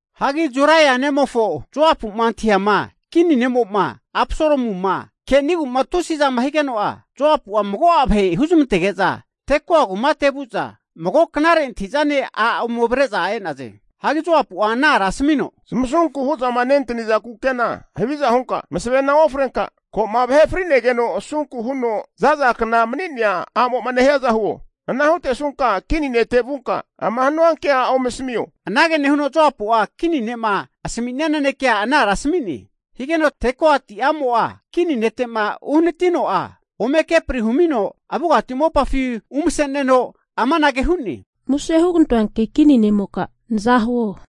Hagi Zeruia nemofo Joapu'ma antahiama kini ne'mo'ma Absalomuma kenigu tusizama higeno'a, Joapua mago'a vahe huzamantege'za Tekoa kumate vu'za, mago knare antahi'zane a' ome avre'za e'naze. Hagi Joapu'a ana ara asamino, Zamasunku hu'zama nentanizankna kukena haviza hunka, masavena ofrenka, ko'ma vahe frinegeno asunku huno za'zakna mani'nea a'mo'ma nehiaza huo. Ana hutesunka kini nete vunka ama hanua kea ome asamio, anage nehuno Joapu'a kini ne'ma asaminia nanekea ana ara asami'ne. Higeno Tekoati a'mo'a kini netema uhanatino'a, ome kepri humino avugati mopafi umase'neno amanage hu'ne, Muse hugantoanki kini ne'moka naza huo!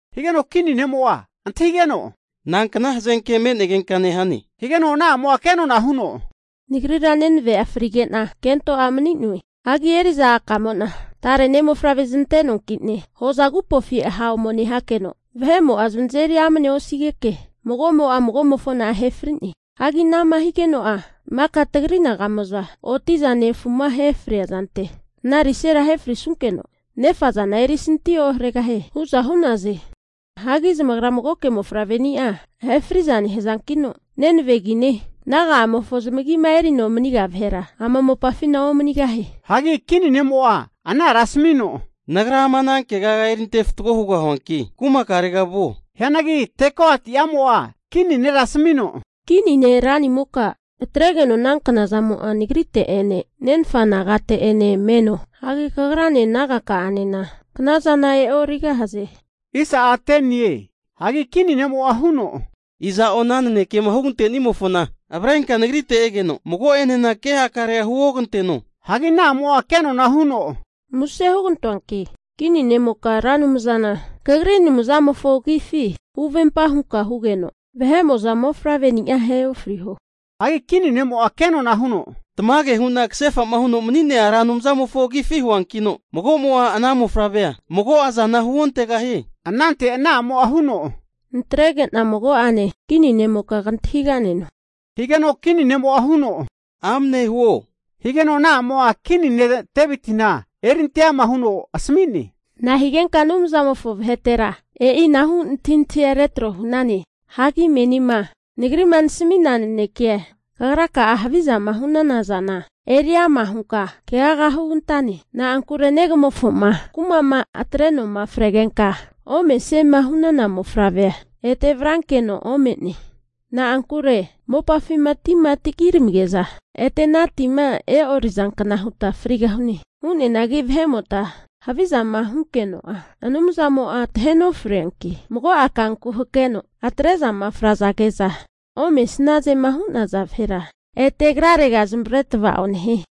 Higeno kini ne'mo'a antahigeno, nankna hazenke me'negenka nehane? Higeno ana a'mo kenona huno, Nagrira neneve'a frige'na kento a' mani'noe. Hagi eri'za a'kamo'na tare ne' mofavre zanante'noankine hoza agupofi ha' ome nehakeno, vahe'mo'a zanazeri amnea osigeke, mago'mo'a mago'mofona ahe fri'ne. Hagi anama higeno'a maka tagri naga'mo'za oti'za nefuma ahe fria zante, ana risera ahe frisunkeno, nefazana erisanti oharegahie hu'za hu'naze. Hagi zamagra magoke mofavreni'a ahe fri'za nehazankino, nenave agine, naga'amofo zamagima erino maniga vahera ama mopafina omanigahie. Hagi kini nemo'a ana ara asamino, Nagra ama ana kegaga eri ante fatgo hugahuanki, kumakarega vuo. Hianagi Tekoati amo'a kini nera asamino, Kini ne' ranimoka, atregeno ana knazamo'a nagrite'ene nenfa nagate'ene meno. Hagi kagrane naga ka'anena knazana e'origahaze. Hagi kini ne'mo'a huno, Iza'o ana nanekema hugantenimofona avrenka nagrite egeno, mago'enena ke hakarea huoganteno. Hagi ana a'mo'a kenona huno, Muse hugantoanki, kini ne'moka Ra Anumzana kagri Anumzankamofo agifi huvempa hunka hugeno, vahe'mo'za mofavre'nia ahe ofriho. Hagi kini ne'mo'a kenona huno, Tamage hu'na kasefa'ma huno'ma mani'nea Ra Anumzamofo agifi huankino mago'mo'a ana mofavrea mago'azana huontegahie. Anante ana a'mo'a huno, Natrege'na mago'ane kini nemoka kantahiga'neno, higeno kini ne'mo'a huno, Amne huo. Higeno ana a'mo'a kini ne' Devitina eri ante ama huno asami'ne, Nahigenka Anumzamofo vahetera e'inahu antahintahia retro hu'nane? Hagi menima nagri'ma nasami'na nanekea, kagraka'a havizama hu'nana zana eri ama hunka keaga hugantane. Na'ankure negamofoma kuma'ma atre'noma fregenka omesiema hu'nana mofavrea, ete avrankeno ome'ne. Na'ankure mopafima tima tagiramige'za ete ana tima e'orizankna huta frigahune. Hu'neanagi vahe'mota havizama hunkeno'a, Anumzamo'a tahe nofrianki, mago'a kanku hakeno atre'zama frazage'za omesnazema hu'naza vahera, ete agrarega zamavare tava'o nehie.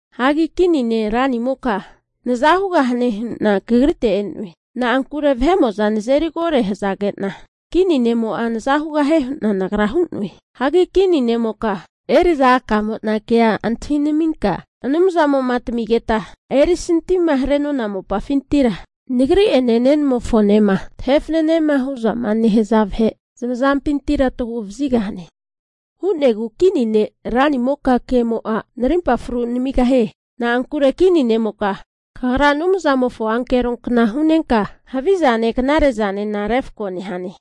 Hagi kini ne' ranimoka, naza hugahane hu'na kagrite e'noe. Na'ankure vahe'mo'za nazeri kore hazage'na, kini ne'mo'a naza hugahie hu'na nagra hu'noe. Hagi kini ne'moka, eri'za a'kamo'na kea antahinaminka Anumzamo'ma tamigeta erisantima hare'nona mopafintira nagri'ene nenamofonema tahe fanenema hu'za nehaza vahe zamazampintira tagu'vazigahane. Hu'negu kini ne' ranimoka kemo'a narimpa fru namigahie. Na'ankure kini ne'moka kagra Anumzamofo ankero kna hu'nenka, havizane knare'zanena refako nehane.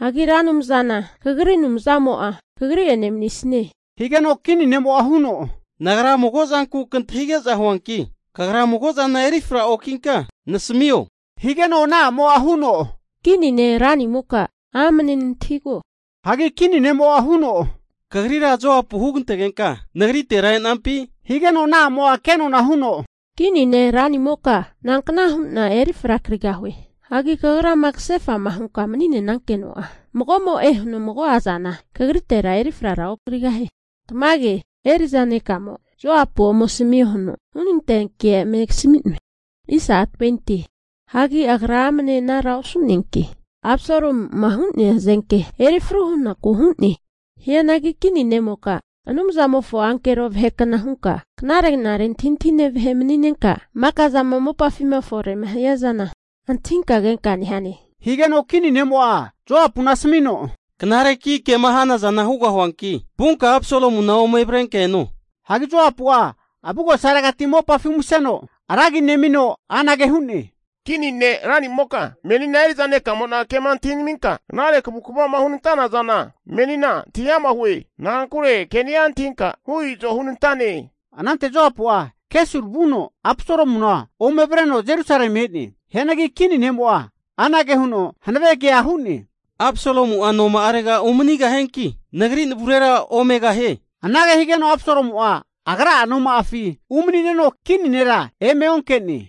Hagi Ra Anumzana, kagri Anumzamo'a kagri'ene manisnie. Higeno kini ne'mo huno, nagra mago zanku kantahige'za huanki kagra mago'zana erifra okinka nasamio, higeno ana a'mo'a huno, kini ne' ranimoka amane nantahigo. Hagi kini ne'mo huno, Kagrira Joapu hugantegenka nagritera enampi? Higeno ana a'mo kenona huno, Kini nera ranimoka, nankna hu'na eri frakigahue? Hagi kagrama kasefa'ma hunka mani'nenankeno'a, mago'mo'e huno mago'azana kagritera eri fraraokigahie. Tamage, eri'za nekamo Joapu ome asamio huno hunantea ke eme kasami'noe. Hagi agra amne anara osu'neanki, Absalomu'ma hu'nea hazenki eri fru hunaku hu'ne. Hianagi kini nemoka, Anumzamofo ankero vahekna hunka, knare'nare antahintahine vahe mani'nenka, maka'zama mopafi'ma fore'ma hiazana antahinka kenka nehane. Higeno kini ne'mo'a Joapuna asamino, Knareki kema hanazana hugahuanki vunka Absalomuna ome avrenka eno. Hagi Joapu'a avugosaregati mopafi umaseno, ra agi nemino anage hu'ne, Kini ne' ranimoka, menina eri'za ne'kamo'na kema antahinaminka knare kavukvama hunantana zana menina antahiama hue. Na'ankure ke'ni'a antahinka hu izo hunantane. Anante Joapu'a Gesur vuno Absalomuna ome avreno Jerusalemi e'ne. Hianagi kini ne'mo'a anage huno hanave kea hu'ne, Absalomu'a noma'arega umanigahianki, nagri navurera omegahie. Anage higeno Absalomu'a agra'a noma'afi umani'neno, kini nera eme onke'ne.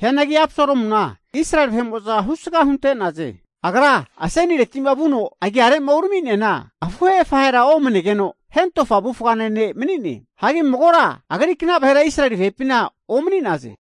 Hianagi Absalomuna Israeli vahe'mo'za husga hunte'naze. Agra asenireti'ma vuno agiare'ma urami'neana, afuhe afahera omanegeno, hentofa avufgane ne' mani'ne. Hagi magora agrikna vahera Israeli vahepina omani'naze.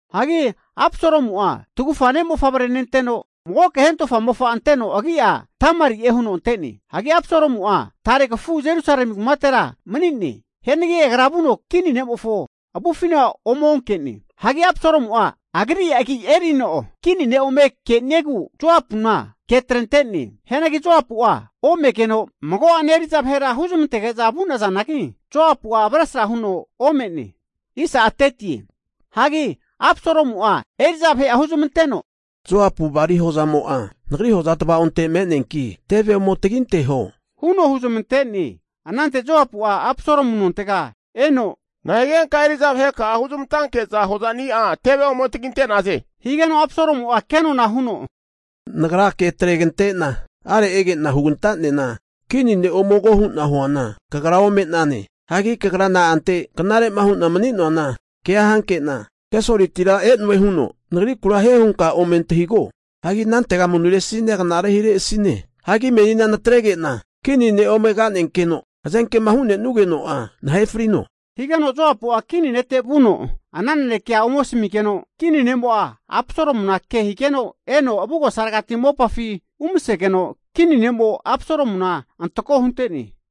Hagi Absalomu'a tagufa ne' mofavre nenteno, magoke hentofa mofa anteno agi'a Tamari'e huno ante'ne. Hagi Absalomu'a tare kafu Jerusalemi kumatera mani'ne. Hianagi agra vuno kini nemofo avufina ome onke'ne. Hagi Absalomu'a agri agi erino kini ne' ome keniegu Joapuna ke atrente'ne. Hianagi Joapu'a omegeno, mago'ane eri'za vahera huzmantege'za vu'nazanagi Joapu'a avesra huno ome'ne. Hagi Absalomu'a eri'za vahe'a huzamanteno, Joapu bali hozamo'a nagri hoza tava'onte me'neanki, teve ome taginteho huno huzmante'ne. Anante Joapu'a Absalomu nontega eno, Nahigenka eri'za vaheka'a huzamantanke'za hozani'a teve ome taginte'naze? Higeno Absalomu'a kenona huno, Nagra ke atregante'na, are ege'na hugantanena kini ne' ome ko hu'na huana kagra ome'nane. Hagi kagra na'ante knare'ma hu'na mani'noana kea hanke'na Gesuritira e'noe huno nagrikura hie hunka ome antahigo. Hagi anantega manuresina knare hiresine. Hagi menina natrege'na kini ne ome ka'nenkeno hazenkema hunenugeno'a nahe frino. Higeno Joapu'a kini nete vuno ana nanekea ome asamigeno, kini ne'mo'a Absalomuna ke higeno eno avugosaregati mopafi umasegeno, kini ne'mo Absalomuna antako hunte'ne.